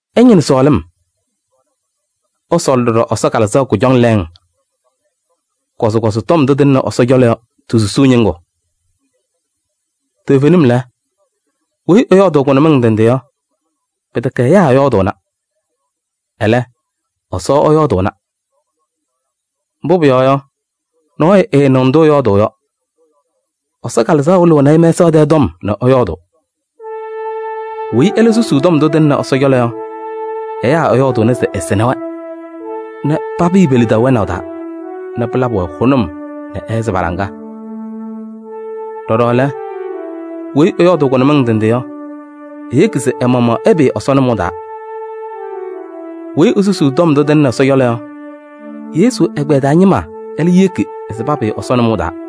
Ɩñɩnɩ sɔɔlɩm. Ɩsɔɔlɩ ɖɔɖɔ Ɛsɔ Kalɩzaɣ kʋjɔŋ lɛɛŋ, kɔzɩkɔzɩ tɔm ndʋ tɩlɩnɩ Ɛsɔ cɔlɔ yɔ ti-susuu ñɩŋgʋ. Toovenim lɛ, weyi ɛyɔɔdʋʋ kʋnʋmɩŋ ndɩ ndɩ yɔ, pɩtɛkɛ ɛyaa ɛyɔɔdʋʋna, ɛlɛ, Ɛsɔ ɛyɔɔdʋʋna. Mbʋ pʋyɔɔ yɔ, nɔɔyʋ ɛɛnɩɣ ndʋ ɛyɔɔdʋʋ yɔ. Ɛsɔ Kalɩzaɣ wɩlɩɣnɩ-ɩ mɛsaɣ tɛɛ tɔm nɛ ɛyɔɔdʋʋ. Weyi ɛlɛ susuu tɔm ndʋ tɩlɩnɩ Ɛsɔ cɔlɔ yɔ, ɛyaa ɛyɔɔdʋʋnɩ se ɛsɩnɩ-wɛ nɛ papɩɩ pe-lidaʋ wɛnaʋ taa nɛ pɩlabɩ-wɛ hʋnʋm nɛ ɛhɛzɩ pa-laŋa. Ɖɔɖɔ lɛ, weyi ɛyɔɔdʋʋ kʋnʋmɩŋ ndɩ ndɩ yɔ, eyeki se ɛ-maɣmaɣ ɛpɩɩ Ɛsɔ nʋmɔʋ taa. Weyi esusuu tɔm ndʋ tɩlɩnɩ Ɛsɔ cɔlɔ yɔ, Yesu ɛgbɛyɛ taa ñɩma ɛlɛ yeki se papɩɩ Ɛsɔ nʋmɔʋ taa.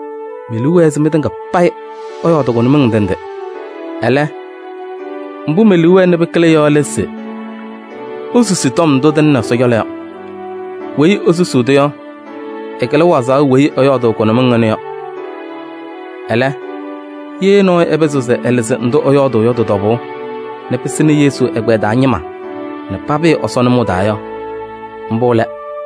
Me-liu wɛɛ se mɩtɩŋa payɩ ɩyɔɔdɩ kʋnʋmɩŋ ndɩ ndɩ. Ɛlɛ, mbʋ me-liu wɛɛ nɛ pɩkɩlɩ yɔ lɛ se isusi tɔm ndʋ tɩlɩnɩ Ɛsɔ cɔlɔ yɔ. Weyi esusuu-tʋ yɔ, ɛkɩlɩ wazaɣ weyi ɛyɔɔdʋʋ kʋnʋmɩŋ ɩnʋ yɔ. Ɛlɛ, ye nɔɔyʋ ɛpɩzɩɣ se ɛlɩzɩ ndʋ ɛyɔɔdʋʋ yɔ tɩ-tɔbʋʋ nɛ pɩsɩnɩ Yesu ɛgbɛyɛ taa ñɩma nɛ papɩɩ Ɛsɔ nʋmɔʋ taa yɔ, mbʋ lɛ.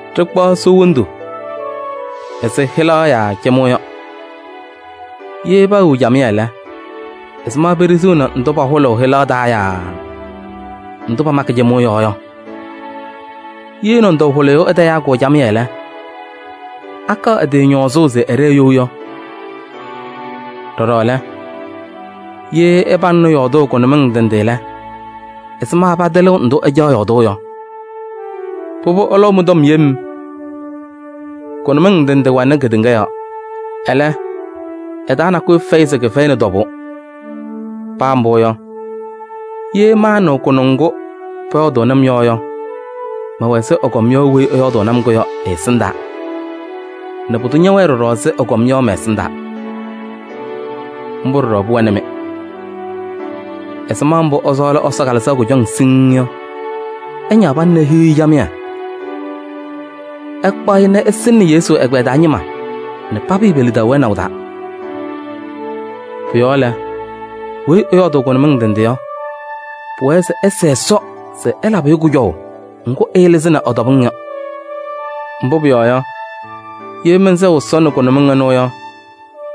Ɖɩkpaɣ soo wondu ɛzɩ hɩlaɣ yaa cɩmʋʋ yɔ: ye paawiɣ camɩyɛ lɛ, ɛzɩma peɖiɣziɣni ndʋ pahʋlʋʋ hɩlaɣ taa yaa ndʋ pamakɩ cɩmʋʋ yɔɔ yɔ? Ye nɔndɔʋ hʋlɩyʋ ɛtayaa-kʋ camɩyɛ lɛ, akaɣ ɛ-tɩ ñɔɔzʋʋ se ɛɖɛɛ you yɔ? Ɖɔɖɔ lɛ, ye ɩpaŋnɩ yɔɔdʋʋ kʋnʋmɩŋ ndɩ ndɩ lɛ, ɛzɩma patɩlɩɣ ndʋ ɩcaɣ yɔɔdʋʋ yɔ? Pʋbʋ ɩlɔʋ mɩ-tɔm yem. Kʋnʋmɩŋ ndɩ ndɩ wɛnɩ kedeŋa yɔɔ. Ɛlɛ, ɩ-taa nakʋyʋ fɛyɩ se kɩfɛyɩnɩ tɔbʋʋ. Paa mbʋ yɔ, ye maanɩɣ kʋnʋŋ ŋgʋ pɔyɔɔdʋʋnɩ-m yɔ yɔ, mɛwɛ ɛzɩ ɛgɔm yɔ weyi ɛyɔɔdʋʋ-kʋ yɔ ɛ-ɛsɩndaa nɛ pʋdʋ ñɛwɛɛ ɖɔɖɔ ɛzɩ ɛgɔm yɔ mɛ-ɛsɩndaa. Mbʋ ɖɔɖɔ pʋwɛnɩ-mɩ. Ɛzɩma mbʋ ɩsɔɔlɩ Ɛsɔ Kalɩzaɣ kʋjɔŋ siŋŋ yɔ, ɩñaɣ pana nɛ ihiɣ-i camɩyɛ. Ɩkpaɣ-ɩ nɛ ɩsɩnɩnɩ Yesu ɛgbɛyɛ taa ñɩma nɛ papɩɩ pe-lidaʋ wɛnaʋ taa. Pʋ-yɔɔ lɛ, weyi ɛyɔɔdʋʋ kʋnʋmɩŋ ndɩ nɖɩ yɔ, pʋwɛɛ se ɛsɛɛ Ɛsɔ se ɛlabɩ-ɩ kʋjɔʋ ŋgʋ ɛɛlɩzɩnɩ ɩ-tɔbɩŋ yɔ. Mbʋ pʋyɔɔ yɔ, ye mɛnsɛɣ Ɛsɔ nɛ kʋnʋmɩŋ ɩnʋ yɔ,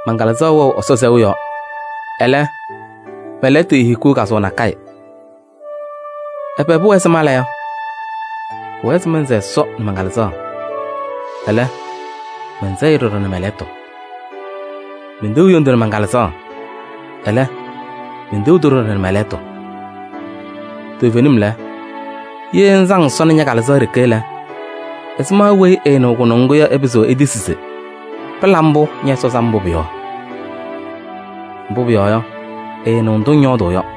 man-Kalɩzaɣ wɛ Ɛsɔ sɛʋ yɔɔ. Ɛlɛ, mɛ-lɛɣtʋ eehikiɣ kazʋwa nakɛyɛ. Ɛbɛ pʋwɛɛ se mala yɔ? Pʋwɛɛ se mɛnsɛɛ Ɛsɔ nɛ man-Kalɩzaɣ. Ɛlɛ, mɛnsɛɣ-ɩ ɖɔɖɔ nɛ mɛ-lɛɣtʋ. Menteɣ hendu nɛ man-Kalɩzaɣ. Ɛlɛ, menteɣ-tʋ ɖɔɖɔ nɛ mɛ-lɛɣtʋ. Toovenim lɛ, ye ŋsaŋ Ɛsɔ nɛ ña-Kalɩzaɣ ɖeke lɛ, ɛzɩma weyi ɛɛnɩɣ kʋnʋŋ ŋgʋ yɔ, ɛpɩzɩɣ etisi se: pɩla mbʋ! Ñɛ-Ɛsɔ sam mbʋ pʋ-yɔɔ? Mbʋ pʋyɔɔ yɔ, ɛɛnɩɣ ndʋ ŋyɔɔdʋʋ yɔ.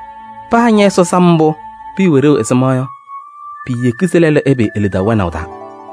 Paa ñɛ-Ɛsɔ sam mbʋ pʋwɛ ɖeu ɛzɩma yɔ, piiyeki se lɛlʋ ɛpɩɩ e-lidaʋ wɛnaʋ taa.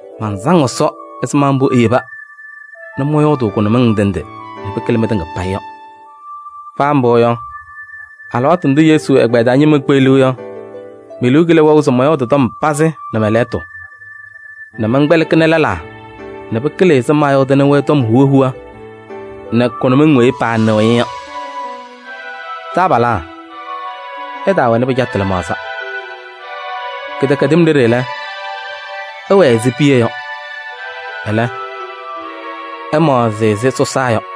Mansaŋ Ɛsɔ ɛzɩma mbʋ eyeba nɛ mɔyɔɔdʋʋ kʋnʋmɩŋ ndɩ ndɩ nɛ pɩkɩlɩ mɩtɩŋa payɩ yɔ. Paa mbʋ yɔ, alɩwaatʋ ndʋ Yesu ɛgbɛyɛ taa ñɩma kpeɣliɣ yɔ, me-liu kɩlɩ wɛʋ se mɔyɔɔdɩ tɔm pazɩ nɛ lɛɣtʋ nɛ mɛnkpɛlɩkɩnɩ lɛlaa nɛ pɩkɩlɩ ɛzɩ maayɔɔdɩnɩ-wɛ tɔm huwa huwa nɛ kʋnʋmɩŋ weyi paanɩɣ-ɩ yɔ. Taabalaa, ɩtaawɛnɩ pɩcatʋ lɩmaɣza. Kɩdɛkɛdɩm ɖeɖe lɛ, ɩwɛɛ ɛzɩ piya yɔ. Ɛlɛ, ɩmaɣzɩ ɛzɩ sɔsaa yɔ.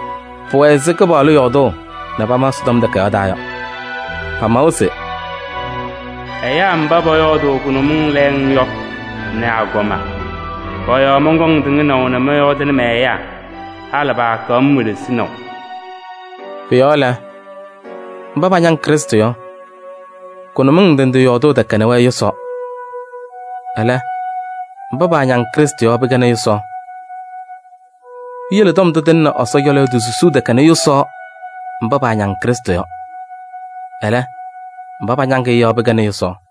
Pʋwɛ ɛzɩ Kɩpaɣlʋ yɔɔdʋʋ nɛ pama Ɛsɔtɔm Takayaɣ taa yɔ. Pamawa se: “Ɛyaa mba pɔyɔɔdʋʋ kʋnʋmɩŋ lɛɛŋ yɔ nɛ agɔma, pɔ-yɔɔ mɔnkɔŋ tɩŋnaʋ nɛ mɔyɔɔdɩnɩ mɛ-ɛyaa. Halɩ paakaɣ-m welesinaʋ.” Pʋ-yɔɔ lɛ, mba pañaŋ Krɩstʋ yɔ, kʋnʋmɩŋ ndɩ ndɩ yɔɔdʋʋ tɛkɛnɩ-wɛ yʋsaɣ. Ɛlɛ, mba paañaŋ Krɩstʋ yɔ pɩkɛnɩ yʋsaɣ. Piyele tɔm ndʋ tɩlɩnɩ Ɛsɔ cɔlɔ yɔ ti-susuu tɛkɛnɩ yʋsaɣ mba paañaŋ Krɩstʋ yɔ. Ɛlɛ, mba pañaŋ-ɩ yɔ pɩkɛnɩ yʋsaɣ.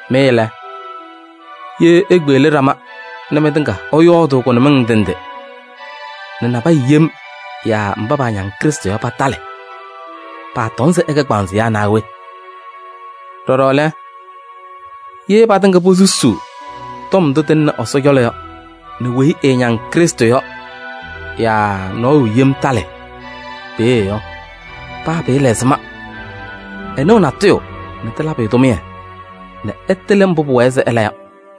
Mɩ lɛ, ye ikpeɣli ɖama nɛ mɩtɩŋa ɩyɔɔdʋʋ kʋnʋmɩŋ ndɩ ndɩ nɛ nabɛyɛ yem yaa mba paañaŋ Krɩstʋ yɔ patalɩ, paatɔŋ se ɩkɛ kpaaŋzɩyaa naa we? Ɖɔɖɔ lɛ, ye patɩŋa posusuu tɔm ndʋ tɩlɩnɩ Ɛsɔ cɔlɔ yɔ nɛ weyi ɛɛñaŋ Krɩstʋ yɔ yaa nɔɔyʋ yem talɩ peeye yɔ, paa pɩɩla ɛzɩma yɔ, ɛnɩɣ natʋyʋ nɛ tɩlabɩ-ɩ tʋmɩyɛ nɛ ɛtɩlɩ mbʋ pʋwɛɛ se ɛla yɔ.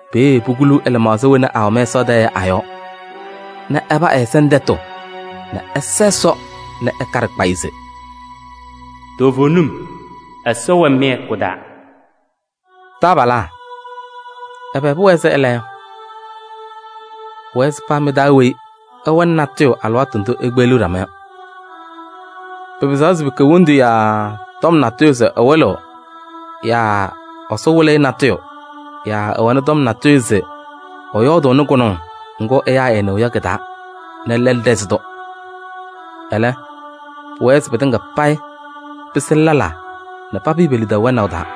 Peeye pukuluu ɛ-lɩmaɣza wena awɛ mɛsaɣ tɛɛ yɔ a-yɔɔ nɛ ɛpa ɛ-ɛza nɛ tɛtʋ nɛ ɛsa Ɛsɔ nɛ ɛkaɖɩ kpayɩ se: “Toovenim, Ɛsɔ wɛ mɩ-hɛkʋ taa.” Taabalaa, ɛbɛ pʋwɛɛ se ɩla yɔ? Pʋwɛɛ se paa mɩ-taa weyi ɛwɛnɩ nabʋyʋ alɩwaatʋ ndʋ ikpeɣliɣ ɖama yɔ. Pɩpɩzaɣ se pɩkɛ hendu yaa tɔm natʋyʋ se ɛwɩlɩɣ yaa Ɛsɔ wɩlɩ-ɩ nabʋyʋ yaa ɛwɛnɩ tɔm natʋyʋ se ɛyɔɔdʋʋnɩ kʋnʋŋ ŋgʋ ɛyaa ɛɛnɩɣ yɔ kɩ-taa nɛ lɛlʋ ɖɛzɩɣ-tʋ. Ɛlɛ, pʋwɛɛ se pɩtɩŋa payɩ pɩsɩnɩ lɛlaa nɛ papɩɩ pe-lidaʋ nʋmɔʋ taa.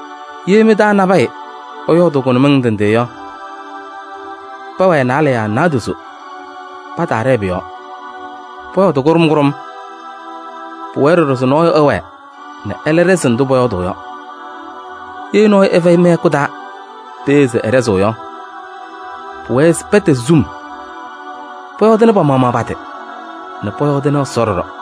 Ye mɩ-taa nabɛyɛ ɛyɔɔdʋʋ kʋnʋmɩŋ ndɩ ndɩ yɔ, pɛwɛɛ naalɛ yaa naadozo, pataaɖɛɛ pʋ-yɔɔ. Pɔyɔɔdɩ kʋɖʋm kʋɖʋm. Pʋwɛɛ ɖɔɖɔ se nɔɔyʋ ɛwɛɛ nɛ ɛlɛ ɖɛzɩɣ ndʋ pɔyɔɔdʋʋ yɔ. Ye nɔɔyʋ ɛfɛyɩ mɩ-hɛkʋ taa peeye se ɛɖɛzɩɣ yɔ, pʋwɛɛ se pɛtɛzɩ sum. Pɔyɔɔdɩnɩ pa-maɣmaɣ pa-tɩ nɛ pɔyɔɔdɩnɩ Ɛsɔ ɖɔɖɔ.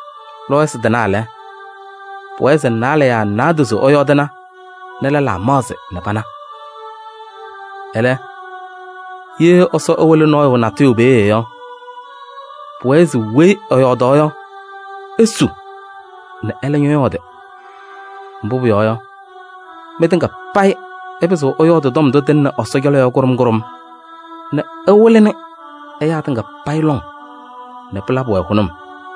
Lɔɔyɩsɩ tɩnaa lɛ, pʋwɛɛ se naalɛ yaa naadozo ɛyɔɔdɩna nɛ lɛlaa maɣzɩ nɛ pana. Ɛlɛ, ye Ɛsɔ ɛwɩlɩ nɔɔyʋ natʋyʋ peeye yɔ, pʋwɛɛ se weyi ɛyɔɔdaɣ yɔ esu nɛ ɛlɛ ñɔyɔɔdɩ. Mbʋ pʋyɔɔ yɔ, mɩtɩŋa payɩ ɩpɩzɩɣ ɩyɔɔdɩ tɔm ndʋ tɩlɩnɩ Ɛsɔ cɔlɔ yɔ kʋɖʋm kʋɖʋm nɛ ɩwɩlɩnɩ ɛyaa tɩŋa payɩ lɔŋ nɛ pɩlabɩ-wɛ hʋnʋm.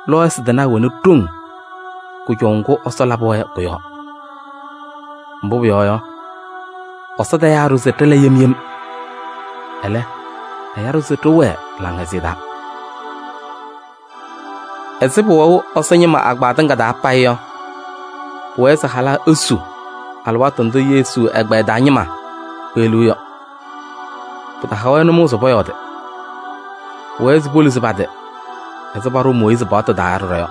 Lɔɔyɩsɩ tɩnaa wɛnɩ ɖoŋ kʋjɔʋ ŋgʋ Ɛsɔ labɩ-wɛ yɔ kʋ-yɔɔ. Mbʋ pʋyɔɔ yɔ, Ɛsɔ tayaa-ɖʋ se ɖɩla yem yem, ɛlɛ, ɛya-ɖʋ se ɖɩwɛɛ laŋhɛzɩyɛ taa. Ɛzɩ pʋwɛʋ Ɛsɔ ñɩma agbaa tɩŋa taa payɩ yɔ, pʋwɛɛ se halaa esu alɩwaatʋ ndʋ Yesu agbaa taa ñɩma kpeɣliɣ yɔ. Pɩtaha-wɛ nʋmɔʋ se pɔyɔɔdɩ. Pʋwɛɛ se poluzi pa-tɩ ɛzɩ paɖʋʋ Mooyiizi paɣtʋ taa ɖɔɖɔ yɔ.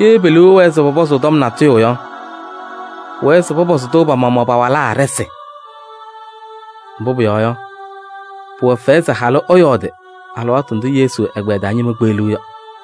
Ye pe-liu ɛwɛɛ se pɔpɔzʋʋ tɔm natʋyʋ yɔ, pʋwɛɛ se pɔpɔzɩ-tʋ pa-maɣmaɣ pa-walaa ɖɩsɩ. Mbʋ pʋyɔɔ yɔ, pʋwɛ fɛyɛ se halʋ ɛyɔɔdɩ alɩwaatʋ ndʋ Yesu ɛgbɛyɛ taa ñɩma kpeɣliɣ yɔ.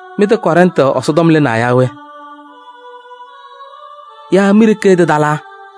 Mɩ-tɛ Kɔrɛntɩ Ɛsɔtɔm lɩnaa yaa we? Yaa mi-ɖeke tɩtalaa?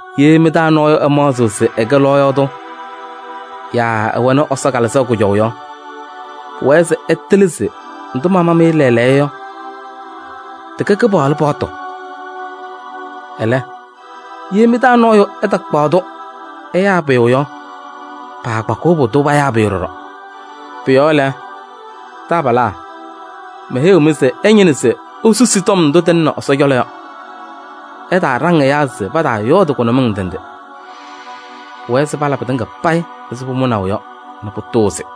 Ye mɩ-taa nɔɔyʋ ɛmaɣzɩɣ se ɛkɛ lɔɔyaɣ tʋ yaa ɛwɛnɩ Ɛsɔ Kalɩzaɣ kʋjɔʋ yɔ, pʋwɛɛ se ɛtɩlɩ se ndʋ mama-mɩ lɛɛlɛɛyɔ yɔ, tɩkɛ Kɩpaɣlʋ paɣtʋ. Ɛlɛ, ye mɩ-taa nɔɔyʋ ɛtakpaɣ-tʋ ɛyaa pʋyʋ yɔ, paakpakɩɣ pʋdʋ payaa pʋyʋ ɖɔɖɔ. Pʋ-yɔɔ lɛ, taabalaa, meheyiɣ-mɩ se ɩñɩnɩ se isusi tɔm ndʋ tɩlɩnɩ Ɛsɔ cɔlɔ yɔ, ɩtaaɖaŋ ɛyaa se pataayɔɔdɩ kʋnʋmɩŋ ndɩ ndɩ. Pʋwɛɛ se pala pɩtɩŋa payɩ ɛzɩ pʋmʋnaʋ yɔ nɛ pʋtʋʋzɩ.